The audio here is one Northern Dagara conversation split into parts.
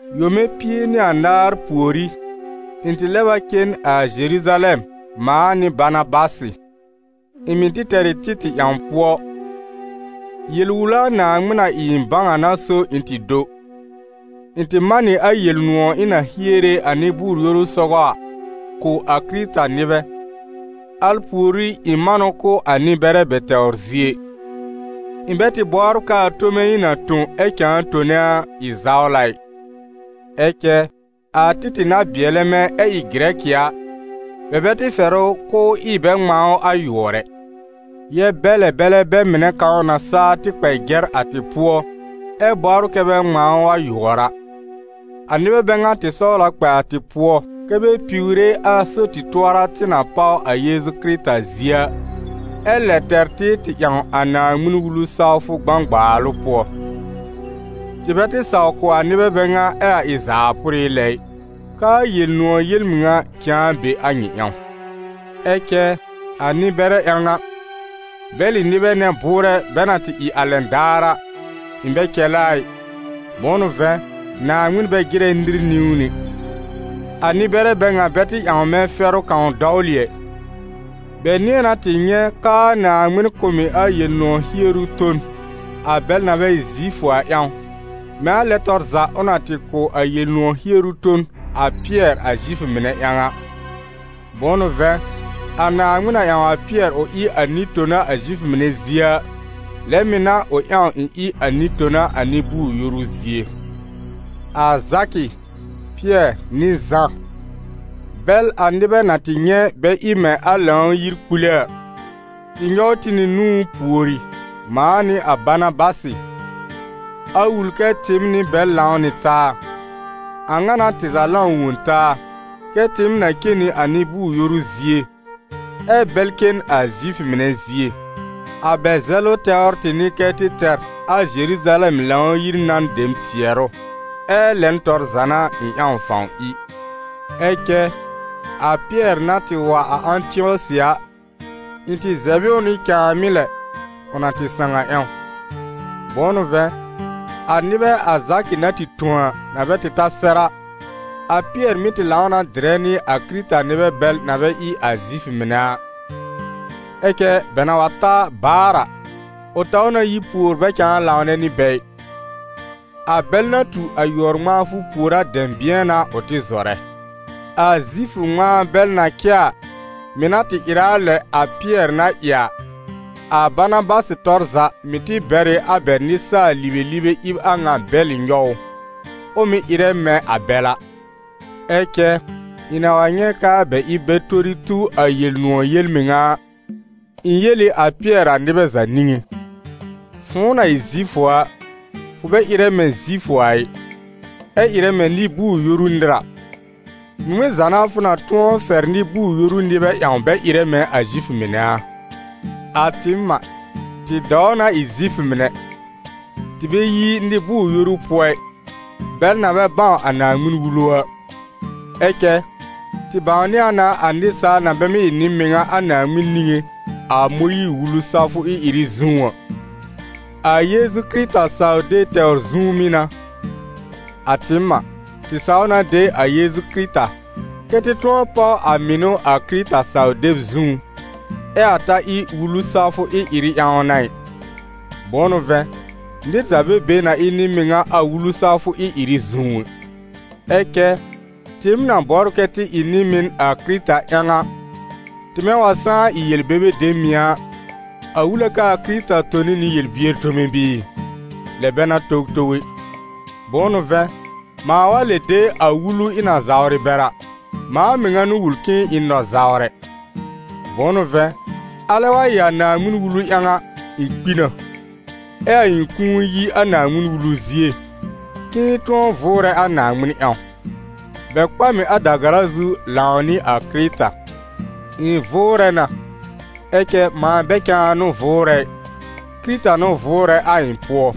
Yome pie nɩ anaar pùorí, ɩ̃ tɩ lɛb a cen a Zeruzalɛm, mãa nɩ Banabasɩ. Ɩ̃ mɩ̀ tɩ tɛr ɩ Títɩ̀ ƴãw pʋɔ. Yel-wula Naaŋmɩn na ɩ ɩ̃ bãw a n'a so ɩ̃ tɩ do. Ɩ̃ tɩ man nɩ a Yel-nʋ̃ɔ̀ ɩ̃ na hiere a nɩ-bʋʋr-yoru sɔgɔ a kʋ̀ a Kɩrɩta-nɩbɛ, al pùorí, ɩ̃ man ʋ kʋ̀ a nɩ-bɛrɛ bɛ tɛwr zie. Ɩ̃ bɛ tɩ bɔbr k'aa tome ɩ̃ na tõ, ɛ cãa tone a, ɩ zawla ɩ. Ɛ cɛ a Títɩ̀ na bɩɛlɛ mɛ̃, ɛ ɩ Gɩrɛkɩ a, bɛ bɛ tɩ fɛr ʋ k'ʋʋ ɩ bɛ ŋmãa a ʋ yʋɔr ɛ, yɛb-bɛlɛ-bɛlɛ bɛ mɩnɛ kãw na saa tɩ kpɛ jɛr a tɩ pʋɔ, ɛ́ bɔbr kɛ bɛ ŋmãa ʋ a yʋɔr a. A nɩbɛ bɛ ŋa tɩ sɔwl a kpɛ a tɩ pʋɔ, kɛ́ bɛ piwre a so-tɩ-tʋɔra tɩ na páw a Yeezu Kɩrɩta zie a, ɛ lɛ tɛr tɩ tɩ ƴãw a Naaŋmɩn-Wulu sawfʋ gbãgbaalʋ pʋɔ. Tɩ bɛ tɩ saw kʋ̀ a nɩbɛ bɛ ŋa ɛ a ɩ zaa pʋrɩ lɛ ɩ, k'aa Yel-nʋ̃ɔ̀ yel-mɩŋa cãa be be a nyɩ ƴãw. Ɛ cɛ a nɩ-bɛrɛ ƴãw a, - bɛlɩ nɩbɛ nɛ bʋʋrɛ bɛ na tɩ ɩ a lɛn daar a, ɩ̃ bɛ cɛlɛ a ɩ, bʋ̃ʋ n'ʋ vɛ̃, Naaŋmɩn bɛ jɩrɛ nɩr niwn ɛ - a nɩ-bɛrɛ bɛ ŋa bɛ tɩ ƴãw mɛ̃ fɛrʋ kãw dɔwlɩ ɛ. Bɛ nɩ̃ɛ na tɩ nyɛ̃ k'aa Naaŋmɩn kʋ̀ m ɩ a Yel-nʋ̃ɔ̀ hieru bon a bɛl na bɛ ɩ Zifʋ a ƴãw, mɛ̃ a lɛn tɔr za ʋ na tɩ kʋ̀ a Yel-nʋ̃ɔ̀ hieru ton a Pɩɛr a Zifʋ mɩnɛ ƴãw a. Bʋ̃ʋ n'ʋ vɛ̃, a Naaŋmɩn na ƴãw a Pɩɛr ʋ ɩ a nɩ-tona a Zifʋ mɩnɛ zie a, lɛ mɩ̀ n'a ʋ ƴãw ɩ̃ ɩ a nɩ-tona a nɩ-bʋʋr-yoru zie. A Zakɩ, Pɩɛr, nɩ Zã, bɛl a nɩbɛ na tɩ nyɛ̃ bɛ ɩ mɛ̃ a Lãw-yir kpule a, tɩ nyɔw tɩ nɩ nũú pùori, mãa nɩ a Banabasɩ, a wul kɛ tɩɩm nɩ bɛl lãw nɩ taa. A ŋa n'a tɩ za lãw wõ taa, kɛ́ tɩɩm na cen nɩ a nɩ-bʋʋr-yoru zie, ɛ bɛl cen a Zifʋ mɩnɛ zie. A bɛ zɛlʋ tɛwr tɩ n'ɩ kɛ tɩ tɛr a Zeruzalɛm Lãw-yir nan dem tɩɛrʋ, ɛ́ lɛn tɔr za n'a ɩ̃ ƴãw fãw ɩ. Ɛ cɛ, a Pɩɛr na tɩ wa a Ãtɩɔsɩ a, ɩ̃ tɩ zɛb ɩ ʋ nɩ cãàmɩ́ lɛ, ʋ na tɩ sãw a ƴãw. Bʋ̃ʋ n'ʋ vɛ̃, a nɩbɛ a Zakɩ na tɩ tõ a, na bɛ tɩ ta sɛr a, a Pɩɛr mɩ́ tɩ lãw na dɩrɛ nɩ a Kɩrɩta-nɩbɛ bɛl na bɛ ɩ a Zifʋ mɩnɛ a; ɛ cɛ bɛ na wa ta baar a, ʋ taw na yi pùor bɛ cãa lãwnɛ nɩ bɛ ɩ; a bɛl na tu a yʋɔr-ŋmãafʋ pùor a dɛ̃bɩ̃ɛ n'a ʋ tɩ zɔrɛ. A Zifʋ ŋmãa bɛl na cɛ a, mɩ̀ na tɩ ɩrɛ a lɛ a Pɩɛr na ɩ a, a Banabasɩ tɔr za mɩ̀ tɩ bɛr ɩ a bɛ nɩsaal-libelibe ɩb a ŋa bɛlɩ nyɔw ʋ, ʋ mɩ̀ ɩrɛ mɛ̃ a bɛl a. Ɛ cɛ ɩ̃ na wa nyɛ̃ k'aa bɛ ɩb bɛ tori tu a Yel-nʋ̃ɔ̀ yel-mɩŋa a, ɩ̃ yel ɩ a Pɩɛr a nɩbɛ za niŋé: «Fʋ̃ʋ na ɩ Zifʋ a, fʋ bɛ ɩrɛ mɛ̃ Zifʋ a ɩ, ɛ ɩrɛ mɛ̃ nɩ-bʋʋr-yoru nɩr a, ŋmɩŋmɩn za n'a, fʋ na tʋ̃ɔ fɛr nɩ-bʋʋr-yoru nɩbɛ ƴãw bɛ ɩrɛ mɛ̃ Zifʋ mɩnɛ a?» A tɩɩm a, tɩ dɔw na ɩ Zifʋ mɩnɛ, tɩ bɛ yi nɩ-bʋʋr-yoru pʋɔ ɩ, bɛl na bɛ bãw a Naaŋmɩn-Wulu a. Ɛ cɛ, tɩ bãwnɩ a na a nɩsaal na bɛ mɩ́ ɩ nɩ-mɩŋa a Naaŋmɩn niŋé a Mõyiir-Wulu sawfʋ ɩ-ɩrɩ zũú a, a Yeezu Kɩrɩta saw-deb tɛwr zũú mɩ́ n'a. A tɩɩm a, tɩ saw na de a Yeezu Kɩrɩta kɛ́ tɩ tʋ̃ɔ páw a mɩnʋ a Kɩrɩta saw-deb zũú, ɛ a ta ɩ Wulu sawfʋ ɩ-ɩrɩ ƴãw n'a ɩ. Bʋ̃ʋ n'ʋ vɛ̃, nɩr za bɛ be na ɩ nɩ-mɩŋa a Wulu sawfʋ ɩ-ɩrɩ zũú ɛ. Ɛ cɛ tɩɩm na bɔbr kɛ́ tɩ ɩ nɩ-mɩn a Kɩrɩta ƴãw a, tɩmɛ wa sãá ɩ yel-bebe dem mɩ̀ a, a wul a k'aa Kɩrɩta tone nɩ yel-bier tome bɩɩ? Lɛ bɛ n'a towtow ɛ! Bʋ̃ʋ n'ʋ vɛ̃, mãa wa lɛb de a Wulu ɩ̃ na zawrɩ bɛr a, mãa mɩŋa n'ʋ wul k'ɩ̃ɩ ɩ n nɔ-zawrɛ. Bʋ̃ʋ n'ʋ vɛ̃, alɛ wa ɩ a Naaŋmɩn-Wulu ƴãw a, ɩ̃ kpi na, ɛ a ɩ̃ kũu yi a Naaŋmɩn-Wulu zie, k'ɩ̃ɩ tʋ̃ɔ vʋʋrɛ a Naaŋmɩn ƴãw. Bɛ kpa m ɩ a da-gara zu lãwnɩ a Kɩrɩta. Ɩ̃ vʋʋrɛ na, ɛ cɛ mãa bɛ cãa n'ʋ vʋʋrɛ ɩ, Kɩrɩta n'ʋ vʋʋrɛ a ɩ̃ pʋɔ.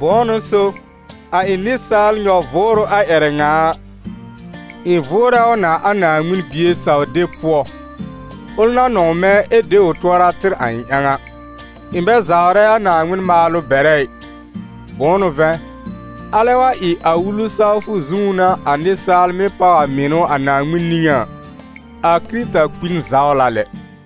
Bʋ̃ʋ n'ʋ so, a ɩ̃ nɩsaal nyɔ-vʋʋrʋ a ƴɛrɛ ŋa a, ɩ̃ vʋʋrɛ ʋ na a Naaŋmɩn Bie saw-deb pʋɔ, ʋl na nɔ̃w mɛ̃ ɛ de ʋ tʋɔra tɩr a ɩ̃ ƴãw a. Ɩ̃ bɛ zawrɛ a Naaŋmɩn maalʋ bɛrɛ ɩ; bʋ̃ʋ n'ʋ vɛ̃, alɛ wa ɩ a Wulu sawfʋ zũú n'a a nɩsaal mɩ́ páw a mɩnʋ a Naaŋmɩn niŋé a, a Kɩrɩta kpi n zawla lɛ.